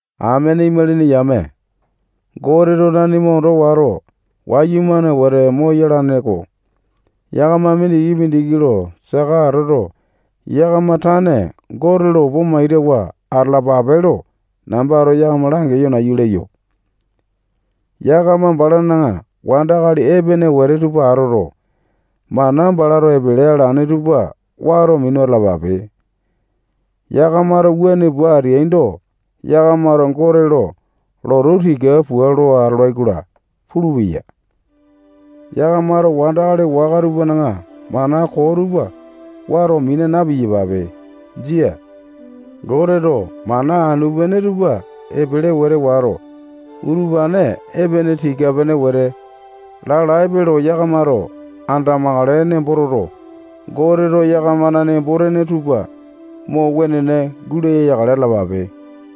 Amene imalini yame, Goteto nanima ondo wato, wayumane wete moyalane-ko. Yakama mindiki-mindiki lo saka atoto, yakama tane Gote lo opa maitawa atalapape lo nambato yakama langeyo nayu leyo. Yakamato balana wandakali epene wete tupa atoto, mana balato epele alane tupa wato minu atalapape. Yakamato wuane pua ateaindo, yakamato Gote lo lotu tika pua lo atolai-kola pulupeya. Yakamato wandakali waka tupana mana koo tupa wato mina na-piyapape. Jia. Goteto mana anu-pene tupa epele wete wato, utupane epene tika-pene wete lalaepe lo yakamato andamakale nembo toto, Goteto yakamana nembo-tene tupa mo wenene gulaya yakale atalapape.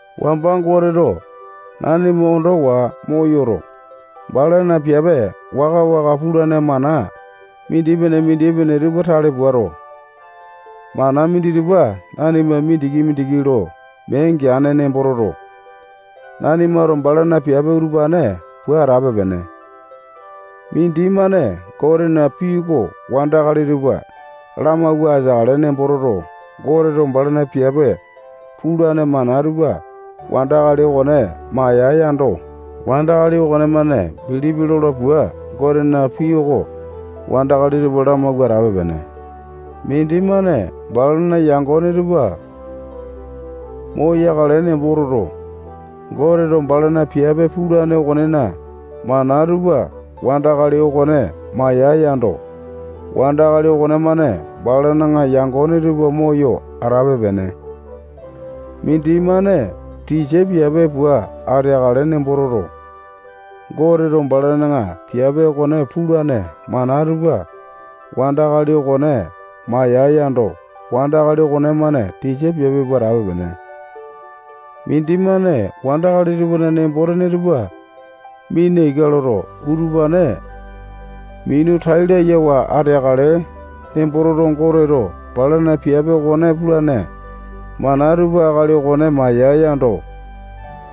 Wamba Goteto nanima ondowa moyoto, balana piape waka-waka pulane mana mindipene-mindipene tupa tale puato, mana minditupa nanima mindiki-mindiki lo mee geane nembo toto, nanimato balana piape utupane pua atape-pene. Mindimane Gotena pii oko wandakali tupa lamauwa ateakale nembo toto, Goteto balana piape pulane mana tupa wandakali okone maiyae yando, wandakali okonemane bilipi lola pua Gotena pii oko wandakali tupa lamauwa atape-pene. Mindimane balana yangone tupa moyakale nembo toto, Goteto balana piape pulane okonena mana tupa wandakali okone maiyae yando, wandakali okonemane balana yangone tupa moyo atape-pene. Mindimane tisa piape pua ateakale nembo toto, Goteto balana piape okone pulane mana tupa wandakali okone maiyae yando, wandakali okonemane tisa piape pua atape-pene. Mindimane wandakali tupana nembo-tene tupa mina ika loto, utupane minu tai layawa ateakale nembo toto, Goteto balana piape okone pulane mana tupa akali okone maiyae yando,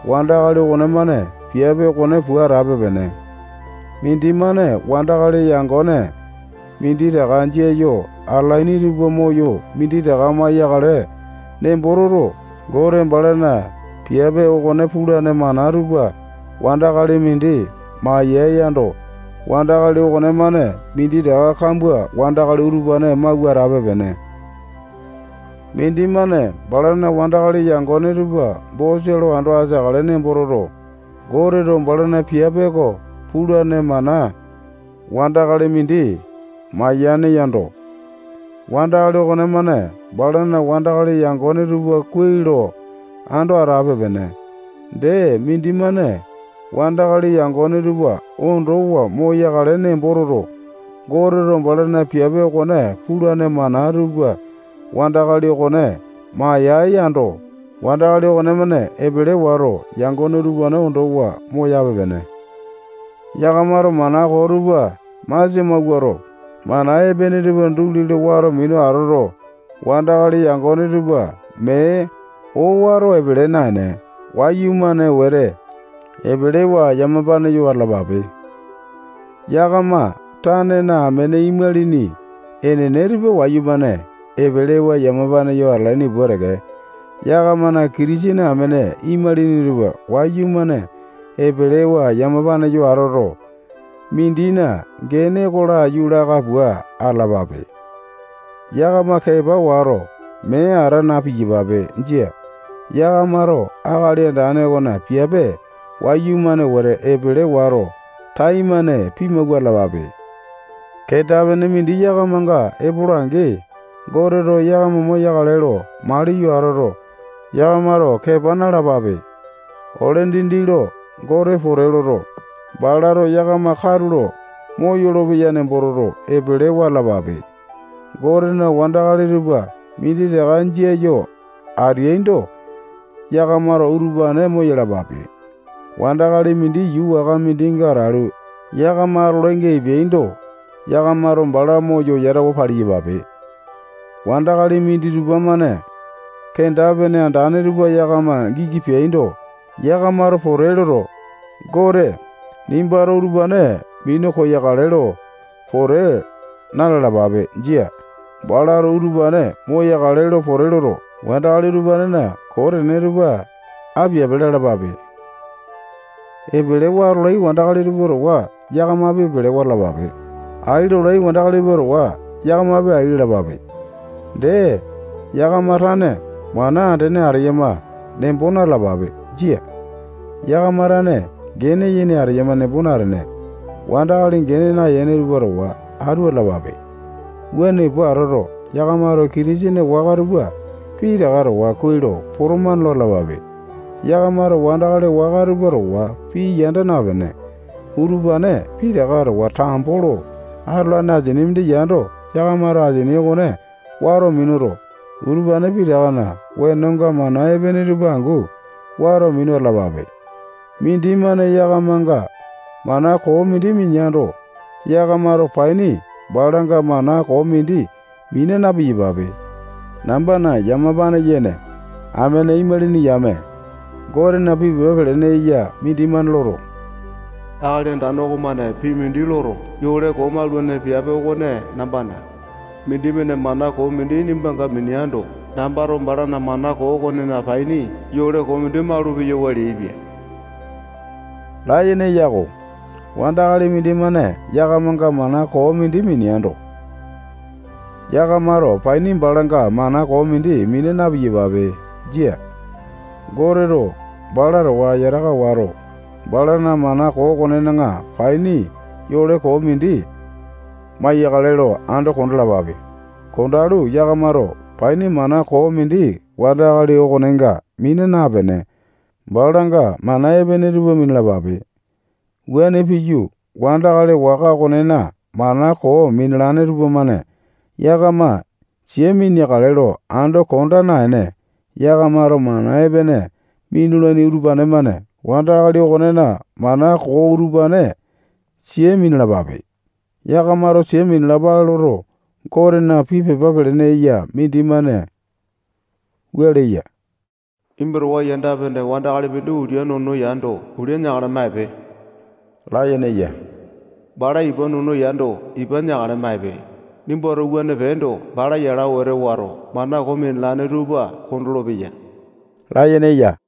wandakali okonemane piape okone pua atape-pene. Mindimane wandakali yangone minditaka jia yo atalaini tupa moyo minditaka maiyakale nembo toto, Gote balana piape okone pulane mana tupa wandakali mindi maiyae yando, wandakali okonemane minditaka kambua wandakali utupane mauwa atape-pene. Mindimane balana wandakali yangone tupa bosa lo ando ateakale nembo toto, Goteto balana piape oko pulane mana wandakali mindi maiyane yando, wandakali okonemane balana wandakali yangone tupa kuai lo ando atape-pene. Dee, mindimane wandakali yangone tupa ondowa moyakale nembo toto, Goteto balana piape okone pulane mana tupa wandakali okone maiyae yando, wandakali okonemane epele wato, yangone utupane ondowa moyape-pene. Yakamato mana koo tupa masia mawuato, mana epene tupa duli lo wato minu atoto, wandakali yangone tupa mee owato epele naene, wayumane wete epelewa yamapane yo atalapape. Yakama tanena amene imalini enene tupa wayumane epelewa yamapane yo atalaini pua teke, yakamana Kitisene amene imalini tupa wayumane epelewa yamapane yo atoto, mindina gene oko laiyu laka pua atalapape. Yakama kepa wato, mee ata na-piyapape. Jia. Yakamato akali Andane okona piape wayumane wete epele wato, taimane pimawua atalapape. Kenda-pene mindi yakamanga epola-angi, Goteto yakama moyakale lo maliyo atoto, yakamato kepa nalapape. Ole dindi lo Gote pote loto, balato yakama katulo moyolo-peya nembo toto, epelewa atalapape. Gotena wandakali tupa minditaka jia yo ateaindo, yakamato utupane moyalapape. Wandakali mindi yuu waka mindinga atalu, yakama atolainga epeando, yakamato bala moyo yatawa paliyapape. Wandakali minditupa-mane kenda-pene andane tupa yakama giki peaindo, yakamato pote loto, Gote, nimbato utupane minu koyakale lo pote na-lalapape. Jia. Balato utupane moyakale lo pote loto, wandakali utupanena koo tene tupa apiape lalapape. Epelewa atolai wandakali tupa towa yakamapi epelewa atalapape. Ai lolai wandakali tupa towa yakamapi ai lalapape. Dee, yakama tane mana andene ateyama nembo na-talapape. Jia. Yakama tane gene yene ateyama nembo natene, wandakali gene nayene tupa towa atu atalapape. Wuane pua atoto, yakamato Kitisene waka tupa pitaka towa kuai lo potomane lo atalapape. Yakamato wandakali waka tupa towa pii yanda napene, utupane pitaka towa tambo lo atolane asini mindi yando, yakamato asini okone wato minuto, utupane pitakana wenonga mana epene tupa angu wato minu atalapape. Mindimane yakamanga mana koo mindi mineando, yakamato paini balanga mana koo mindi mina na-piyapape. Nambana yamapane yene amene imalini yame, Gotena pii pepa pelene eya mindimane loto, Akali Andane okomane pii mindi loto, yole koo maulane piape okone nambana. Mindimane mana koo mindi nimbanga mineando, nambato balana mana koo okona paini yole koo mindi malu-peyawa leaipia layene eya-ko. Wandakali mindimane yakamanga mana koo mindi mineando, yakamato paini balanga mana koo mindi mina na-piyape. Jia. Goteto bala towa yataka wato, balana mana koo okonena paini yole koo mindi maiyakale lo ando kondalapape. Kondalu, yakamato paini mana koo mindi wandakali okonenga mina napene, balanga mana epene tupa minalapape. Wuane piyu, wandakali waka okonena mana koo minalane tupamane yakama sia miniakale lo ando konda naene, yakamato mana epene minulaini utupane-mane wandakali okonena mana koo utupane sia minalapape. Yakamato sia minalapale loto, Gotena pii pepa pelene eya mindimane wua leya: Nimba towa yanda-pene wandakali mindi ulia nono yando, ulia neakale maipe layene eya. Bala ipa nono yando, ipa neakale maipe. Nimbato wuane peendo, bala yala wete wato, mana koo minalane tupa kondolo-peya layene eya.